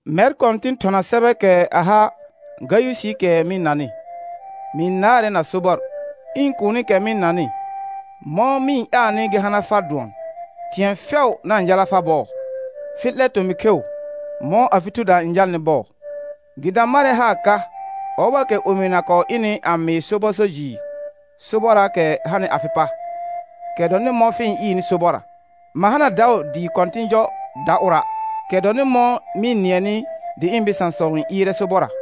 Mɛr kɔ̃tɩn thɔna sɛbɛɛkɛ a ha Gayʋsɩɩkɛ mɩ-n nanɩ. Mɩ-n naarɛ na sobɔr. Ɩ̃ kuunikɛ mɩ-n nanɩ, mɔ̃ mɩ-n ƴaalnɩ gɩ hana far dʋɔn, thɩ̃ɛ fɛʋ na-n jala far bɔɔ, fɩ 'lɛ tomɩ kheu, mɔ̃ afɩ thuda n jalnɩ bɔɔ. Gɩ da marɛ haar ka, ɔbɔɔkɛ omɩna kɔɔ ɩnɩ a mɩɩ sobɔ so jɩɩr sobɔrraakɛ hanɩ afɩ pa, kɛ dɔnɩ mɔ̃ fɩ-n ɩɩrnɩ sobɔrra. Ma hana daʋ dɩɩ kɔ̃tɩ̃ jɔ da ʋra', kɛ dɔnɩ mɔ̃ mɩ-n nɩɛnɩ dɩ ɩ̃ bɩsãsɔ n ɩɩrɛ sobɔrra.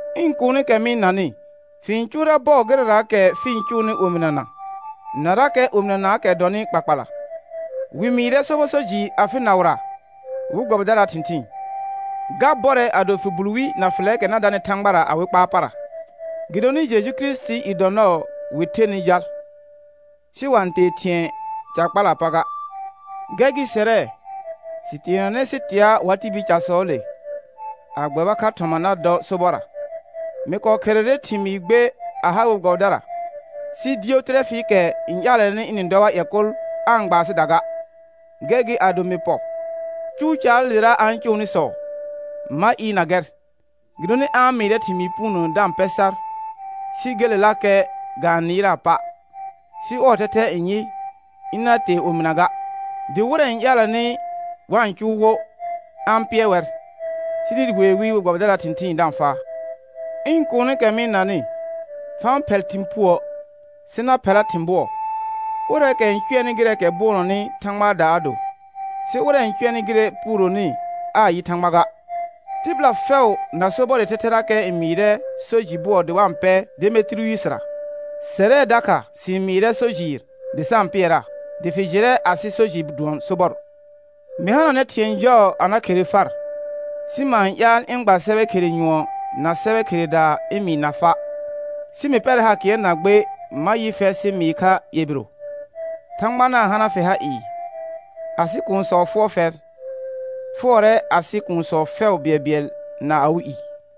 Ɩ̃ kuunikɛ mɩ-n nanɩ, fɩ-n cʋʋrɛ bɔɔ gɩrɛraakɛ fɩ-n cʋʋnɩ omɩnana, narakɛ omɩnanaakɛ dɔnɩ kpakpala. Wɩ mɩɩrɛ sobɔ so jɩɩr afɩ naʋra we gbɛbɩdaraa thɩ̃thɩɩn; ga bɔrɛ ado fɩ bul wi na fɩlɛɛkɛ na danɩ Thãgbara awɩ kpaar para. Gɩdonɩ Jeju Kirisitii i dɔ nɔɔ wɩ thenɩ jal, sɩ wa-n tee thɩ̃ɛ ca kpalaa pa ga. Gɛr gɩ sɛrɛ, sɩ teenanɛ sɩ tea wa tibil casɔɔle, a gbɛba kha thɔma na dɔ sobɔrra. Mɩ kɔɔ kherere thɩmɩɩr gbe a ha we gbɛbɩdara, sɩ Diyotɩrɛfɩɩkɛ n ƴaalɛnɩ ɩnɩ-n dɔ war ƴɛ kʋl aa-n gba asɩda ga. Gɛr gɩ ado mɩ pɔ, cʋʋ caalera a-n cʋʋnɩsɔ ma ɩɩrna gɛr, gɩdonɩ a-n mɩɩrɛ thɩmɩɩ puunə da-n pɛ sar, sɩ gelelakɛ ga-n nɩɩraa pa', sɩ ɔɔ thɛthɛ n yɩ, ɩna tee omɩna ga, dɩ wɩrɛ n ƴaalɛnɩ wa-n cʋʋ wo a-n pɩɛr wɛr, sɩ dɩ wee wɩ we gbɛbɩdaraa thɩ̃thɩɩn da-n faa. Ɩ̃ kuunikɛ mɩ-n nanɩ, fa-n phɛl thɩ̃ puə', sɩ na phɛla thɩ̃ bʋɔ. Ʋrɛɛkɛ n cʋɛnɩ gɩrɛɛkɛ bʋɔnɔnɩ Thãgbaada a do, sɩ ʋrɛ n cʋɛnɩ gɩrɛ puurohi aa yɩ Thãgba ga. Tɩbɩla fɛʋ na sobɔrɩ thɛthɛrakɛ n mɩɩrɛ so jɩ bʋɔ dɩ wa-n pɛ Demetiriynsira; sɛrɛ dakha sɩ-n mɩɩrɛ so jɩɩr dɩ sa-n pɩɛraa, dɩ fɩ jɩrɛ asɩ so jɩ dʋɔn sobɔr. Mɩ hananɛ thɩ̃ɛ jɔɔ a na khere far, sɩ ma-n ƴaal ɩ̃ gba sɛbɛ khere nyʋɔn na sɛbɛ kheredaa ɩ̃ mɩɩna fa'. Sɩ mɩ pɛrɛ haar kɩɛr na gbe ma yɩ fɛr sɩ mɩɩ kha ƴɛ biro. Thãgba na-n hana fɩ ha ɩɩ. Asɩ kuunsɔ fʋɔr fɛr; fʋɔrɛ asɩ kuunsɔ fɛʋ bɩɛlbɩɛl na awɩ i.